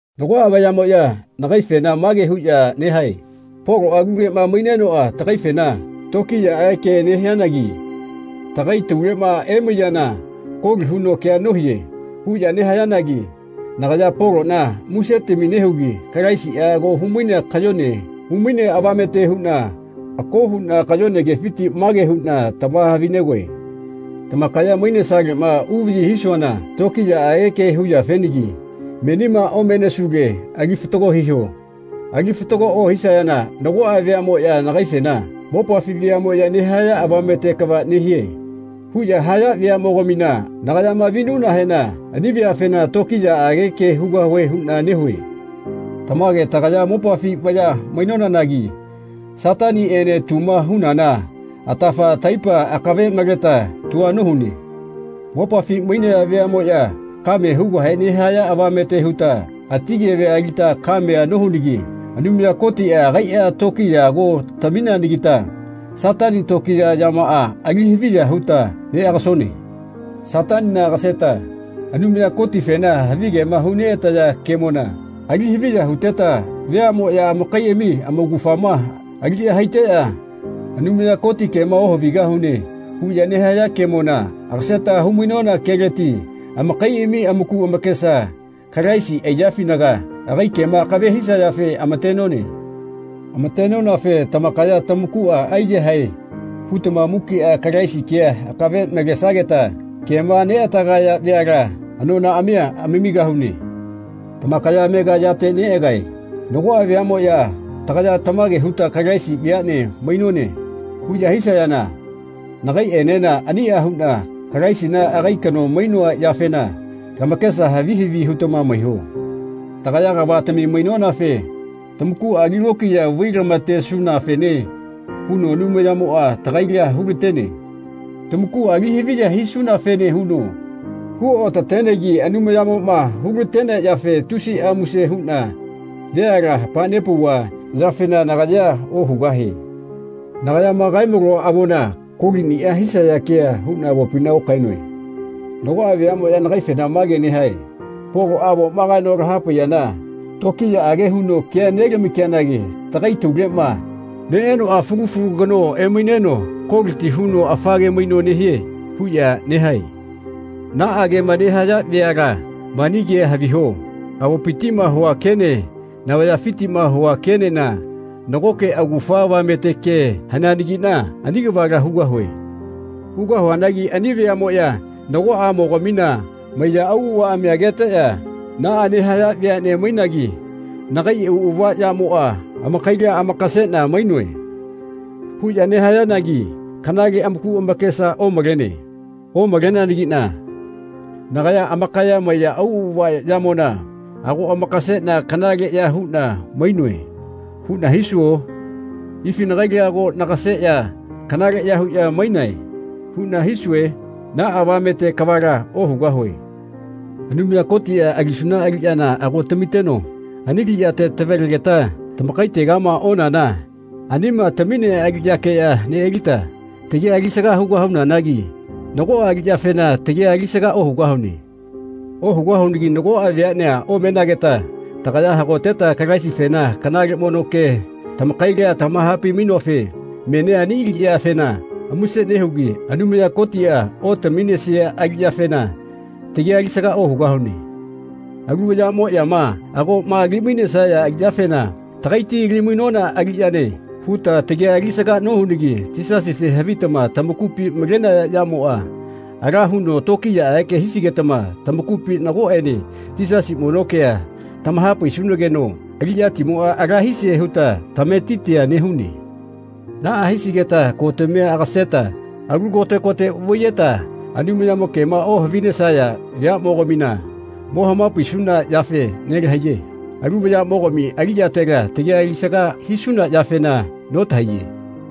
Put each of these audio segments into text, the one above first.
Nagoꞌa vayaꞌmoꞌya nagaifena mage huꞌya nehae “Poloꞌa aluleꞌma mainenoꞌa tagaifena tokiyaꞌage ke nehianagi tagai tauleꞌma emaiyana koli huno kea nohie.” huꞌya nehayanagi nagaya Poloꞌna musetami nehugi Kalaisiꞌa ako huno kayone humainea avamete huꞌna ako huꞌna kayone kefiti mage huꞌna tamahavi-negoe. Tamakaya mainesaleꞌma uvaꞌyi hisuana tokiyaꞌage ke huyafenagi menima omenesule ali fatago hiho. Ali fatago ohisayana nagoꞌa veaꞌmoꞌya nagaifena “Mopafi veaꞌmoꞌya nehaya avamete kava nehie.” huꞌya haya veaꞌmogamina nagayama vinuꞌnahena ani veafena tokiyaꞌage ke hugahue huꞌna nehue. Tamage tagaya mopafi vaya mainonanagi Sataniꞌene tuma hunana atafa laipa akave maleta tua nohune. Mopafi mainaya veaꞌmoꞌya kame hugahe nehaya avamete huta ati kevea alita kamea nohunagi Anumaya Kotiꞌa agaiꞌa tokiya ago tamineanagita Satani tokiya yamaꞌa ali haviya huta neꞌagasone. Satanina agaseta Anumaya Kotifena havigema huneꞌataya kemona ali haviya huteta veaꞌmoꞌya amakaiꞌami amaugafama aliꞌya haiteꞌya “Anumaya Koti kema ohavigahune.” huꞌya nehaya kemona agaseta hu-mainona keleti amakaiꞌami amaku amakesa Kalaisi aiyafinaga agai kema akave hisayafe amatenone. Amatenonafe tamakaya tamakuꞌa aiyahae hutama mukiꞌa Kalaisi kea akave malesageta kema neꞌatagaya veala anonaꞌamia anamigahune. Tamakaya amega yate neꞌagae. Nagoꞌa veaꞌmoꞌya “Tagaya tamage huta Kalaisi veaꞌne mainone.” huꞌya hisayana nagaiꞌenena aniꞌa huꞌna Kalaisina agai kano mainoa yafena lamakesa havi havi hutama maiho. Tagaya kavatami mainonafe tamakuꞌa ali lokiya vailama-tesunafene huno Anumayamoꞌa tagaila hulatene. Tamakuꞌa ali haviya hisunafene huno huotatenegi Anumayamoꞌma hulatenea yafe tusiꞌa muse huꞌna veala hamanepauva yafena nagayea ohugahie. Nagayama kae-maloa avona koliꞌniꞌa hisaya kea huꞌna avopina okaenoe. Nagoꞌa veaꞌmoꞌya nagaifena mage nehae “Poloꞌa avoma kaeno lahapaiyana tokiyaꞌage huno keanelama-kianagi tagai tauleꞌma neꞌenoꞌa fulu fulu kano emaineno koliti huno afa ke maino nehie.” huꞌya nehae. Naꞌa kema nehaya veala mani kea haviho. Avopitiꞌma hua kene navayafitiꞌma hua kenena nagoke augafa avamete ke haneanagiꞌna ani kavala hugahue. Hugahuanagi ani veaꞌmoꞌya nagoꞌamogamina maiya auꞌavaꞌami ageteꞌya “Naꞌa nehaya veaꞌne mainagi nagai auꞌava yamoꞌa amakaila amakaseꞌna mainoe.” huꞌya nehayanagi kanale amaku amakesa omalene. Omaleneanagiꞌna nagaya “Amakaya maiya auꞌava yamona ago amakaseꞌna kanaleꞌya huꞌna mainoe.” huꞌna hisuo? “Ifi nagaila ago nagaseꞌya kanaleꞌya huꞌna mainae.” huꞌna hisue? Naꞌa avamete kavala ohugahue. Anumaya Kotiꞌa alisuna aliꞌyana ago tamiteno ani aliꞌyate tavalegeta tamakaitegama onana anima taminea aliꞌyakeꞌya neꞌalita tagia alisaga hugahunanagi nagoꞌa aliꞌyafena tagia alisaga ohugahune. Ohugahunagi nagoꞌa veaꞌnea omenageta tagaya hagoteta Kalaisifena kanale mono kea tamakaila tamahapai-mainonafe menia ani aliꞌyafena muse nehugi Anumaya Kotiꞌa otaminesia aliꞌyafena tagia alisaga ohugahune. Alu vayaꞌmoꞌyama agoꞌma ali-mainesaya aliꞌyafena “Tagaiti ali-mainona aliꞌyane.” huta tagia alisaga nohunagi Yisasife havitama tamakupi malenaya yamoꞌa ala huno tokiyaꞌage hisigetama tamakaipina nagoꞌene Yisasi mono kea tamahapaisunageno aliꞌyatimoꞌa ala hisie huta tametitia nehune. Naꞌa hisigeta kotamia agaseta alu kote kote vaiyeta Anumayamo kema ohavinesaya veaꞌmogamina mo hamapaisuna yafe nelahaiye. Alu vayaꞌmogami aliꞌyatela tagia alisaga hisuna yafena notahaiye.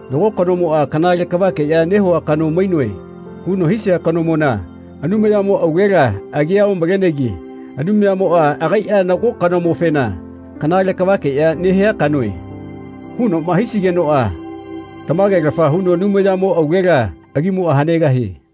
Nago kanomoꞌa “Kanale kavakeꞌya nehua kano mainoe.” huno hisia kanomona Anumayamo aulela agia omalenegi Anumayamoꞌa agaiꞌa nago kanomofena “Kanale kavakeꞌya nehia kanoe.” hunoꞌma hisigenoꞌa tamagelafa huno Anumayamo aulela agimoꞌa hanegahie.